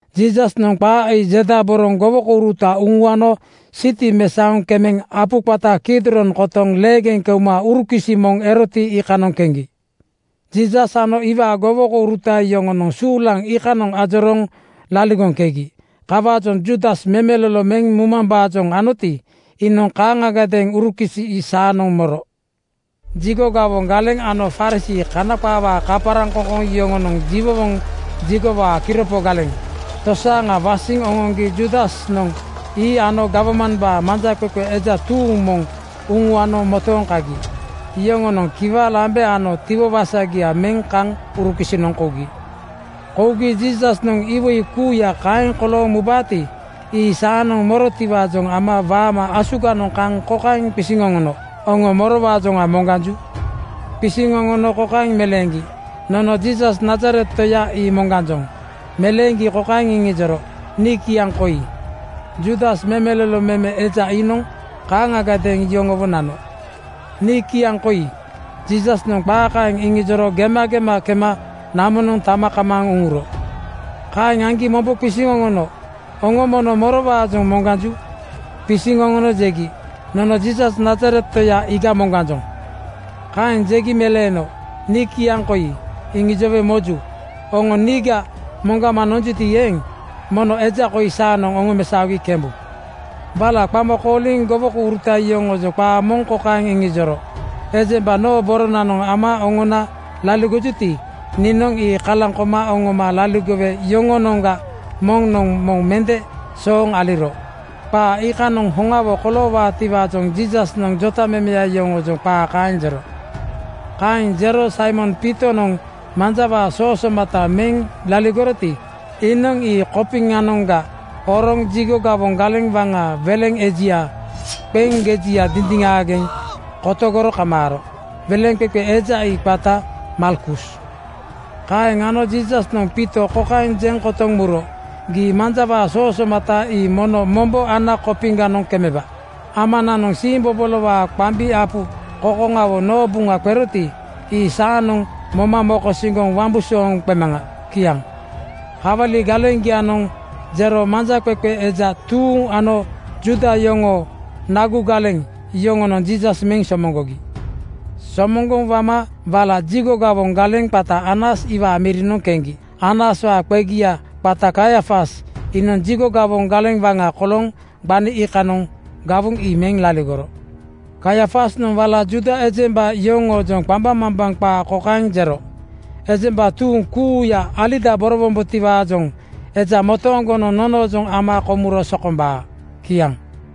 Jiisasnoŋ qaa ii jedaboroŋ gowokouruta uŋuano siti mesaoŋ kemeŋ apu qata Kidron kotoŋ leegeŋ keuma urukisi moŋ eroti, iikanoŋ keŋgi. Jiisas ano iwaa gowokouruta yoŋonoŋ suulaŋ iikanoŋ ajorooŋ laligoŋkegi. Kawaajoŋ Juudas memelolo meŋ mumambaajoŋ anoti, iinoŋ kaaŋagadeeŋ urukisi ii saanoŋ moro. Jigo gawoŋ galeŋ ano Farisii (Kana qaawaa kaparaŋkoŋkoŋ) yoŋonoŋ jiwowoŋ jigowaa kiropo galeŋ (sikiriti) tosaaŋa wasiŋ oŋoŋgi Juudasnoŋ ii ano gawmambaa manjaqeqe eja tuuŋ moŋ uŋuano motooŋ kagi. Yoŋonoŋ kiwa lambe ano tiwo wasagia meŋ kaŋ urukisinoŋ kougi. Kougi Jiisasnoŋ iwoi kuuya kaeŋ kolooŋ mubaati, ii saanoŋ morotiwaajoŋ ama waama asuganoŋ kaŋ kokaeŋ qisiŋ oŋono, “Oŋo morowaajoŋa moŋganju?” Qisiŋ oŋono kokaeŋ meleeŋgi, “Nono Jiisas Nazaret toya ii moŋganjoŋ.” Meleeŋgi kokaeŋ iŋijoro, “Nii kiaŋ koi.” Juudas memelolo meme eja iinoŋ kaaŋagadeeŋ yoŋowo nano. “Nii kiaŋ koi.” Jiisasnoŋ qaa kaeŋ iŋijoro gemagema kema namonoŋ tama kamaaŋ uŋuro. Kaeŋ aŋgi mombo qisiŋ oŋono, “Oŋo mono morowaajoŋ moŋganju?” Qisiŋ oŋono jegi, “Nono Jiisas Nazaret toya iiga moŋganjoŋ.” Kaeŋ jegi meleeno, “Nii kiaŋ koi, iŋijowe mojuya. Oŋo niiga moŋgama nonjuti eeŋ, mono eja koi saanoŋ oŋomesaogi kembu.” Wala qama kooliŋ gowokouruta yoŋoojoŋ qaa moŋ kokaeŋ iŋijoro, “Ejemba noo boronanoŋ ama oŋona laligojuti, niinoŋ ii kalaŋ koma oŋoma laligowe yoŋoonoŋga moŋnoŋ moŋ mende sooŋ aliro.” Qaa iikanoŋ hoŋawo koloowaatiwaajoŋ Jiisasnoŋ jotamemeya yoŋoojoŋ qaa kaeŋ jero. Kaeŋ jero Saimon Piitonoŋ manjawaa soo somata meŋ laligoroti, iinoŋ ii kopiŋanoŋga horoŋ jigo gawoŋ galeŋ waŋaa weleŋ ejia qeŋ gejia dindiŋaageŋ kotogoro kamaaro. Weleŋqeqe eja ii qata Malkus. Kaaŋ ano Jiisasnoŋ Piito kokaeŋ jeŋ kotoŋ muro, “Gii manjawaa soo somata ii mono mombo ana kopiŋganoŋ kemeba. Amananoŋ siimbobolowaa qambi apu kokoŋawo noo buŋa qeroti, ii saanoŋ moma mokosiŋgoŋ wambusooŋ qemaŋa.” Kiaŋ. Kawali galeŋgianoŋ jero manjaqeqe eja tuuŋ ano Juuda yoŋoo nagu galeŋ (sikiriti) yoŋonoŋ Jiisas meŋ somoŋgogi. Somoŋgoŋ wama wala jigo gawoŋ galeŋ qata Anas iwaa mirinoŋ keŋgi. Anaswaa qegaya qata Kaiafas iinoŋ jigo gawoŋ galeŋ waŋa kolooŋ gbani iikanoŋ gawoŋ ii meŋ laligoro. Kaiafasnoŋ wala Juuda ejemba yoŋoojoŋ qambaŋmambaŋ qaa kokaeŋ jero, “Ejemba tuuŋ kuuya alidaborowombotiwaajoŋ eja motooŋgonoŋ nonoojoŋ ama komuro sokombaa.” Kiaŋ.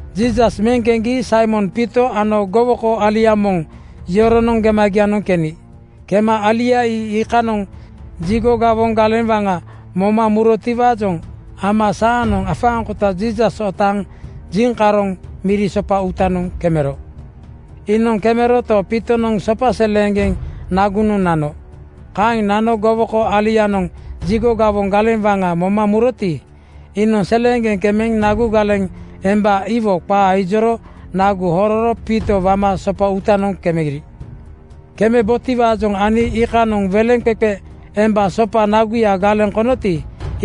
Jiisas meŋ keŋgi Saimon Piito ano gowoko alia moŋ yoronoŋ gemagianoŋ keni. Kema alia iikanoŋ jigo gawoŋ galeŋ waŋa moma murotiwaajoŋ ama saanoŋ afaaŋkota Jiisas otaaŋ jiŋkaroŋ miri sopa uutanoŋ kemero. Iinoŋ kemeroto, Piitonoŋ sopa seleeŋgeŋ nagunoŋ nano. Kaeŋ nano gowoko alianoŋ jigo gawoŋ galeŋ waŋa moma muroti, iinoŋ seleeŋgeŋ kemeŋ nagu galeŋ emba iwo qaa ijoro nagu hororo Piito wama sopa uutanoŋ kemeri. Kemebotiwaajoŋ ani iikanoŋ weleŋqeqe emba sopa naguya galeŋ konoti,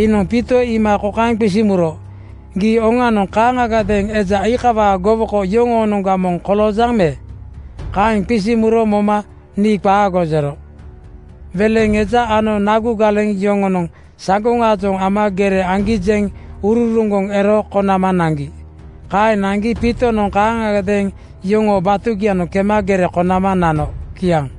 iinoŋ Piito iima kokaeŋ qisiŋ muro, “Gii oŋanoŋ kaaŋagadeeŋ eja iikawaa gowoko yoŋoonoŋga moŋ koloojaŋ me?” Kaeŋ qisiŋ muro moma “Nii qaago!” jero. Weleŋ eja ano nagu galeŋ (sikiriti) yoŋonoŋ saŋgoŋaajoŋ ama gere aŋgi jeŋ uroroŋgoŋ ero konama naŋgi. Kaeŋ naŋgi Piitonoŋ kaaŋagadeeŋ yoŋoo batugianoŋ kema gere konama nano. Kiaŋ.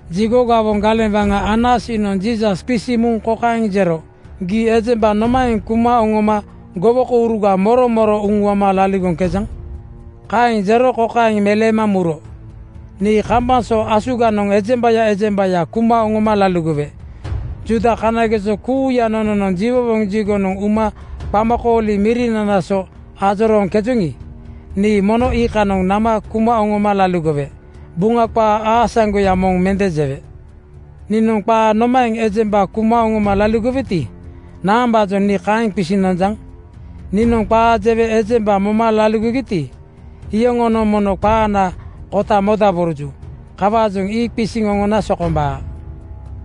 Jigo gawoŋ galeŋ waŋa Anas iinoŋ Jiisas qisiŋ muŋ kokaeŋ jero, “Gii ejemba nomaeŋ kuma oŋoma gowokouruga moro moro uŋuama laligoŋkejaŋ?” Kaeŋ jero kokaeŋ meleema muro, “Nii kambaŋ so asuganoŋ ejembaya ejembaya kuma oŋoma laligowe. Juuda kanageso kuuya nononoŋ jiwowoŋ jigonoŋ uma qamakooli mirinana so ajorooŋkejoŋi, nii mono iikanoŋ nama kuma oŋoma laligowe. Buŋa qaa aasaŋgoya moŋ mende jewe. Niinoŋ qaa nomaeŋ ejemba kuma oŋoma laligoweti, naambaajoŋ nii iikaeŋ qisiŋ nonjaŋ? Niinoŋ qaa jewe ejemba moma laligogiti, iyoŋonoŋ mono qaanaa kota modaboroju. Kawaajoŋ ii qisiŋ oŋona sokombaa.”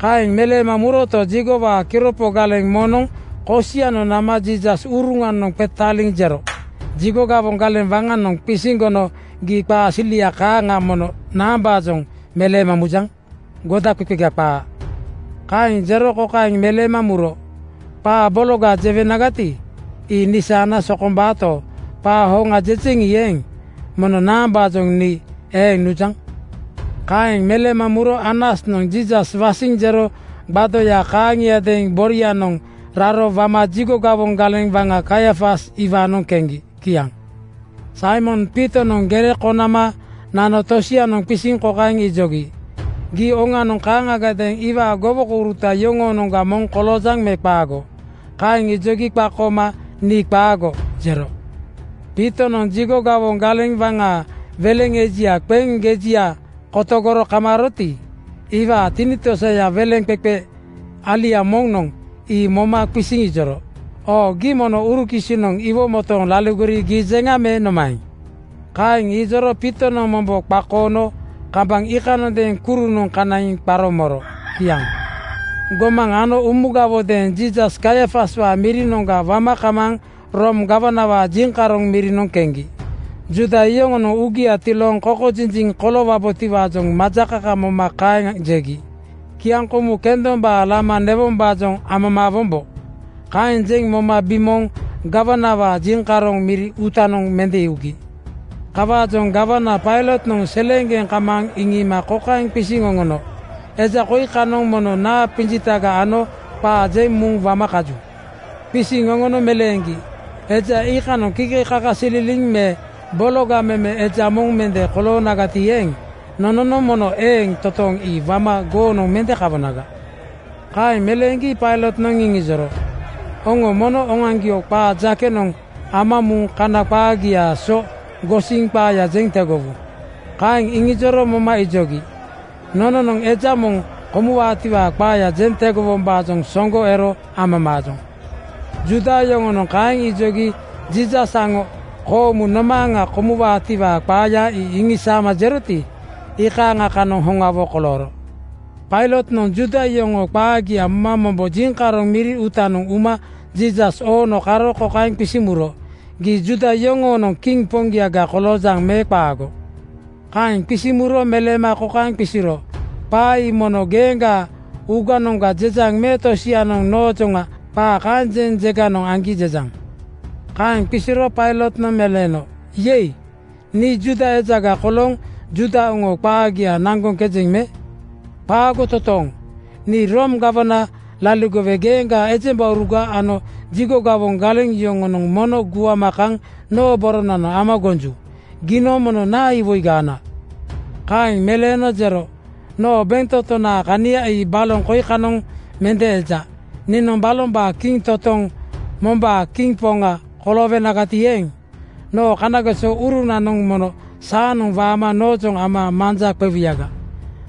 Kaeŋ meleema muroto, jigowaa kiropo galeŋ (sikiriti) moŋnoŋ kosianoŋ nama Jiisas uruŋanoŋ qetaaliŋ jero, “Jigo gawoŋ galeŋ waŋanoŋ qisiŋ gono gii qaa silia kaaŋa mono naambaajoŋ meleema mujaŋ? Godaqeqega qaa.” Kaeŋ jero kokaeŋ meleema muro, “Qaa bologaga jewenagati, ii nisaana sokombaato, qaa hoŋa jejeŋi eeŋ, mono naambaajoŋ nii eeŋ nujaŋ?” Kaeŋ meleema muro Anasnoŋ Jiisas wasiŋ jero gbadoya kaaŋiadeeŋ borianoŋ raro wama jigo gawoŋ galeŋ waŋa Kaiafas iwaanoŋ keŋgi. Kiaŋ. Saimon Piitonoŋ gere konama nano tosianoŋ qisiŋ kokaeŋ ijogi, “Gii oŋanoŋ kaaŋagadeeŋ iwaa gowokouruta yoŋoonoŋga moŋ koloojaŋ me qaago?” Kaeŋ ijogi qakooma “Nii qaago!” jero. Piitonoŋ jigo gawoŋ galeŋ waŋaa weleŋ ejia qeŋ gejia kotegoro kamaaroti, iwaa tinitosaya weleŋqeqe alia moŋnoŋ ii moma qisiŋ ijoro, “Oo gii mono urukisinoŋ iwo motooŋ laligori giijeŋa me nomaeŋ?” Kaeŋ ijoro Piitonoŋ mombo qakoono kambaŋ iikanondeeŋ kurunoŋ kanaiŋ qaro moro. Kiaŋ. Gomaŋ ano umugawodeeŋ Jiisas Kaiafaswaa mirinoŋga wama kamaaŋ Room gawanawaa jiŋkaroŋ mirinoŋ keŋgi. Juuda yoŋonoŋ uugia tilooŋ kokojinjiŋ koloowombotiwaajoŋ majakaka moma kokaeŋ jegi, “Kiaŋkomu kendombaa lama newombaajoŋ amamaa-wombo.” Kaeŋ jeŋ moma bimooŋ gawanawaa jiŋkaroŋ miri uutanoŋ mende ugi. Kawaajoŋ gawana Pailotnoŋ seleeŋgeŋ kamaaŋ iŋiima kokaeŋ qisiŋ oŋono, “Eja koi kanoŋ mono naa qinjitaga ano qaa jeŋ muŋ wama kaju?” Qisiŋ oŋono meleeŋgi, “Eja iikanoŋ kikekakasililiŋ me bologa meme eja moŋ mende koloonagati eeŋ, nononoŋ mono eeŋ toontooŋ ii wama goonoŋ mende kawonaga.” Kaeŋ meleeŋgi Pailotnoŋ iŋijoro, “Oŋo mono oŋoaŋgio qaa jakeyanoŋ ama muŋ Kana qaagiaa so gosiŋ qaaya jeŋ tegowu.” Kaeŋ iŋijoro moma ijogi, “Nononoŋ eja moŋ komuwaatiwaa qaaya jeŋ tegowombaajoŋ soŋgo ero amamaajoŋ.” Juuda yoŋonoŋ kaeŋ ijogi Jiisas aŋo koomu nomaaŋa komuwaatiwaa qaaya ii iŋisaama jeroti, iikaaŋa kanoŋ hoŋawo kolooro. Pailotnoŋ Juuda yoŋoo qaagia moma mombo jiŋkaroŋ miri uutanoŋ uma Jiisas oono karo kokaeŋ qisiŋ muro, “Gii Juuda yoŋoonoŋ kiŋ poŋgiaga koloojaŋ me qaago?” Kaeŋ qisiŋ muro meleema kokaeŋ qisiro, “Qaa ii mono geeŋgaa uuganoŋga jejaŋ me tosianoŋ noojoŋa qaa kaeŋ jeŋ jeganoŋ aŋgi jejaŋ?” Kaeŋ qisiro Pailotnoŋ meleeno, “Yei! Nii Juuda ejaga kolooŋ Juuda oŋoo qaagia naŋgoŋkejeŋ me? Qaago totooŋ! Nii Room gawana laligowe geeŋgaa ejembauruga ano jigo gawoŋ galeŋ yoŋonoŋ mono guama kaŋ noo boronoŋ ama gonju. Giinoŋ mono naa iwoiga ana?” Kaeŋ meleeno jero, “Noo bentotonaa kania ii baloŋ kokoinoŋ mende eja. Niinoŋ balombaa kiŋ-totoŋ mombaa kiŋ poŋa koloowenagati eeŋ, noo kerasuru-urunanoŋ mono saanoŋ waama noojoŋ ama manja qewuyaga.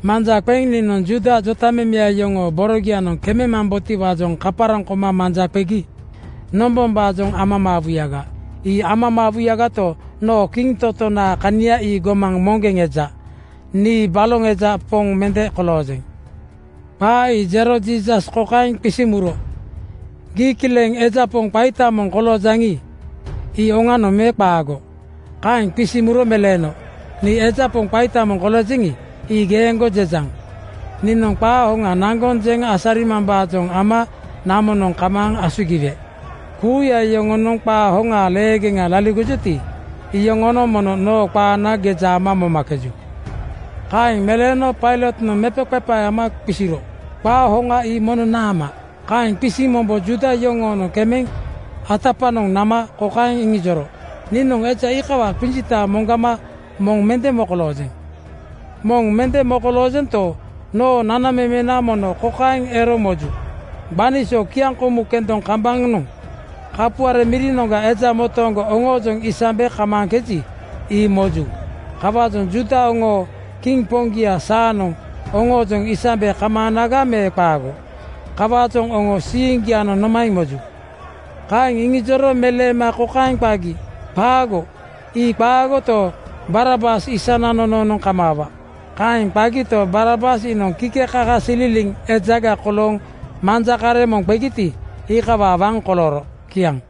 Manja qeŋ niinoŋ Juuda jotamemeya yoŋoo borogianoŋ kememambotiwaajoŋ kaparaŋ koma manja qegi nombombaajoŋ amamaawuyaga. Ii amamaawuyagato, noo kiŋ-totonaa kania ii gomaŋ moŋgeŋ eja. Nii baloŋ eja poŋ mende koloojeŋ.” Qaa ii jero Jiisas kokaeŋ qisiŋ muro, “Gii kileŋ eja poŋ qaita moŋ koloojaŋi, ii oŋanoŋ me qaago?” Kaeŋ qisiŋ muro meleeno, “Nii eja poŋ qaita moŋ koloojeŋi, ii geeŋgo jejaŋ. Niinoŋ qaa hoŋa naŋgoŋ jeŋ asarimambaajoŋ ama namonoŋ kamaaŋ asugiwe. Kuuya yoŋonoŋ qaa hoŋaa leegeŋa laligojuti, iyoŋonoŋ mono noo qaana geja ama momakeju.” Kaeŋ meleeno Pailotnoŋ mepaqepae ama qisiro, “Qaa hoŋa ii mono naama?” Kaeŋ qisiŋ mombo Juuda yoŋoonoŋ kemeŋ atapanoŋ nama kokaeŋ iŋijoro, “Niinoŋ eja iikawaa qinjita moŋgama moŋ mende mokoloojeŋ. “Moŋ mende mokoloojento, noo nanamemena moŋ kokaeŋ ero moju: Gbani so kiaŋkomu kendoŋ kambaŋanoŋ kapuare mirinoŋga eja motooŋgo oŋoojoŋ isambe kamaaŋkeji, ii moju. Kawaajoŋ Juuda oŋoo kiŋ poŋgia saanoŋ oŋoojoŋ isambe kamaanaga me qaago? Kawaajoŋ oŋo siiŋgianoŋ nomaeŋ moju?” Kaeŋ iŋijoro meleema kokaeŋ qagi, “Qaago, ii qaagoto, Barabas isana nonoonoŋ kamaawa!” Kaeŋ qagito, Barabas iinoŋ kikekakasililiŋ ejaga kolooŋ manja kareŋ moŋ qegiti, iikawaa waŋ kolooro. Kiaŋ.